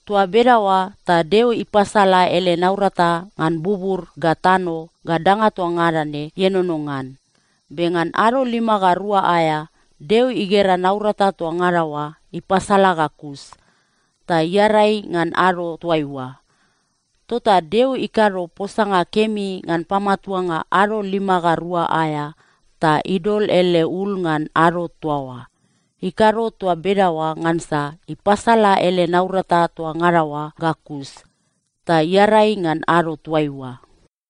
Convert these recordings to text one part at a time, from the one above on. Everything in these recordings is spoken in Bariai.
Toa bedaoa ta Deo ipasala ele naurata ngan bubur ga tano ga danga toa ngada ne ienono ngan. Be ngan ado lima ga rua aea, Deo igera naurata toa ngada oa ipasala ga kus, ta iarai ngan ado toaiua. Tota Deo ikado posanga kemi ngan pamatuanga ado lima ga rua aea ta idol ele ul ngan ado toa oa. Ikado toa bedaoa ngansa ipasala ele naurata toa ngada oa ga kus, ta iarai ngan ado toaiua.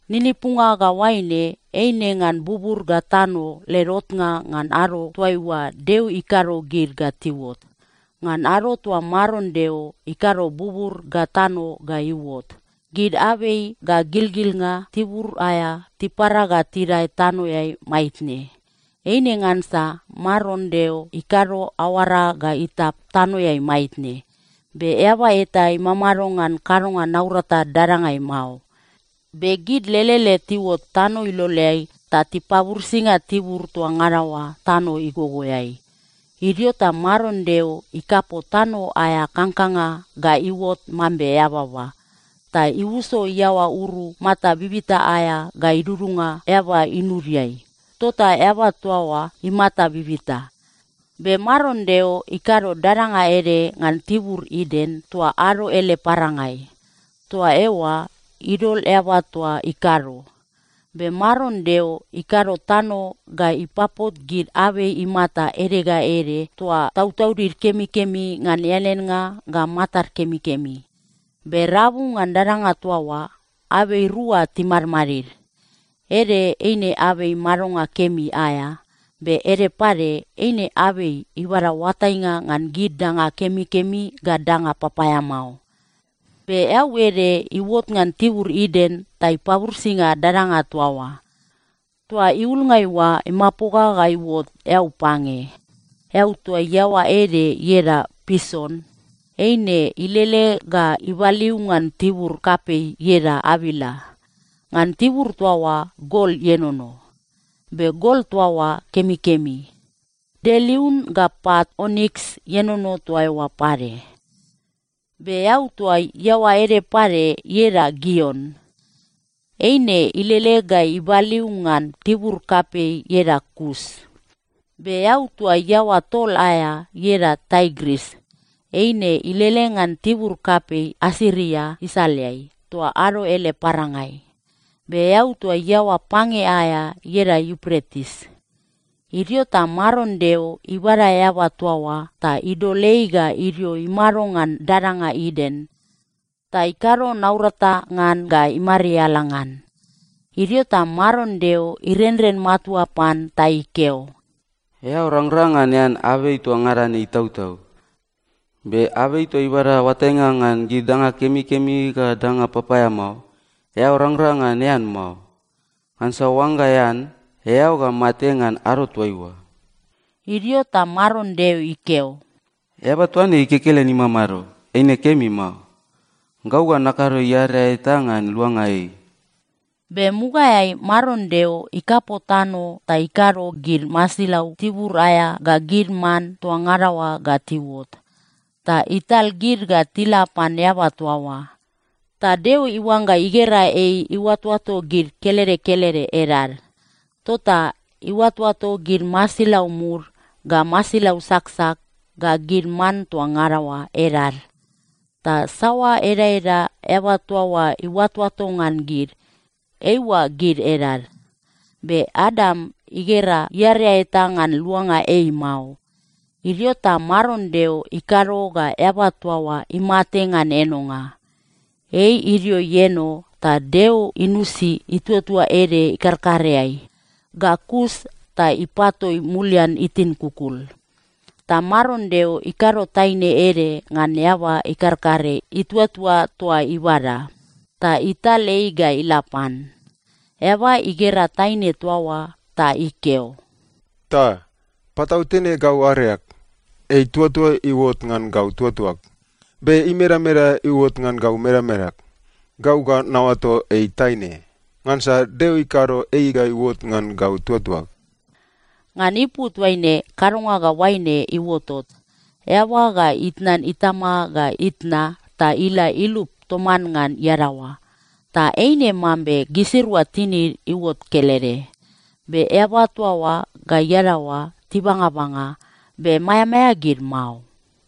Ninipunga ga oaine eine ngan bubur ga tano led otnga ngan ado toaiua Deo ikado gid ga tiuot. Ngan ado toa Maron Deo ikado bubur ga tano ga iuot, gid abei ga gilgilnga tibur aea tipara ga tidae tanoeai maitne. Eine ngansa Maron Deo ikado aoara ga itap tanoeai maitne, be eaba eta imamado ngan kadonga naurata dadangai mao. Be gid lelele tiuot tano iloleai ta tipaburisinga tibur toa ngada oa tano igogoeai. Idio ta Maron Deo ikapo tano aea kangkanga ga iuot mambe eababa. Ta iuso iaoa uru mata bibita aea ga idudunga eaba inudiai. Tota eaba toa oa imata bibita. Be Maron Deo ikado dadanga ede ngan tibur Iden toa ado ele parangai. Toa eoa idol eaba toa ikado. Be Maron Deo ikado tano ga ipapot gid abei imata ede ga ede toa tautaudid kemikemi ngan eaneannga ga matad kemikemi. Be rabu ngan dadanga toa oa, abei rua timadmadid. Ede eine abei madonga kemi aea, be ede pade eine abei ibada oatainga ngan gid danga kemikemi ga danga papaeamao. Be eau ede iuot ngan tibur Iden ta ipaburisinga dadanga toa oa. Toa iulngai oa imapoga ga iuot eau pange. Eau toa iaoa ede ieda Pison. Eine ilele ga ibaliu ngan tibur kapei ieda Avila. Ngan tibur toa oa gol ienono. Be gol toa oa kemikemi. Delium ga pat oniks ienono toa eoa pade. Be eau toa iaoa ede pade ieda Gion. Eine ilele ga ibaliu ngan tibur kapei ieda Kus. Be eau toa iaoa tol aea ieda Taigris. Eine ilele ngan tibur kapei Asiria isaleai toa ado ele parangai. Be eau toa iaoa pange aea ieda Iupretis. Idio ta Maron Deo ibada eaba toa oa ta idol ei ga idio imado ngan dadanga Iden, ta ikado naurata ngan ga imariala ngan. Idio ta Maron Deo irenren matua pan ta ikeo, “Eao rangrang ngan ean abei toa ngada ne itautau, be abei toa ibada oatainga ngan gid danga kemikemi ga danga papaeamao, eao rangrang ngan ean mao. Ngansa oangga ean, eao ga mate ngan ado toaiua.” Idio ta Maron Deo ikeo, “Eaba toa ne ei kekelen imamado, eine kemi mao. Gau ga nakado iarea eta ngan luanga ei.” Be mugaeai Maron Deo ikapo tano ta ikado gid masilau tibur aea ga gid man toa ngada oa ga tiuot. Ta ital gid ga tila pan eaba toa oa, ta Deo iuangga igera ei iuatoato gid kelede kelede edad. Tota iuatoato gid masilau mud ga masilau saksak ga gid man toa ngada oa edad. Ta saoa edaeda eaba toa oa iuatoato ngan gid, eiua gid edad. Be Adam igera iarea eta ngan luanga ei mao. Idio ta Maron Deo ikado ga eaba toa oa imate ngan enonga. Ei idio ieno, ta Deo inusi ituatua ede ikarkareai. Ga kus ta ipatoi mulian itin kukul. Ta Maron Deo ikado taine ede ngan eaba ikarkare ituatua toa ibada. Ta ital ei ga ila pan. Eaba igera taine toa oa ta ikeo, “Ta! Patautene gau areag! Ei ituatua iuot ngan gau tuatuag. Be imedameda iuot ngan gau medamedag. Gau ga naoato ei ‘taine,’ ngansa Deo ikado ei ga iuot ngan gau tuatuag.” Ngan ipu toaine kadonga ga oaine iuotot: Eaba ga itnan itama ga itna ta ila ilup toman ngan iadaoa, ta eine mambe gisirua tinid iuot kelede. Be eaba toa oa ga iadaoa tibangabanga, be maeamaea gid mao.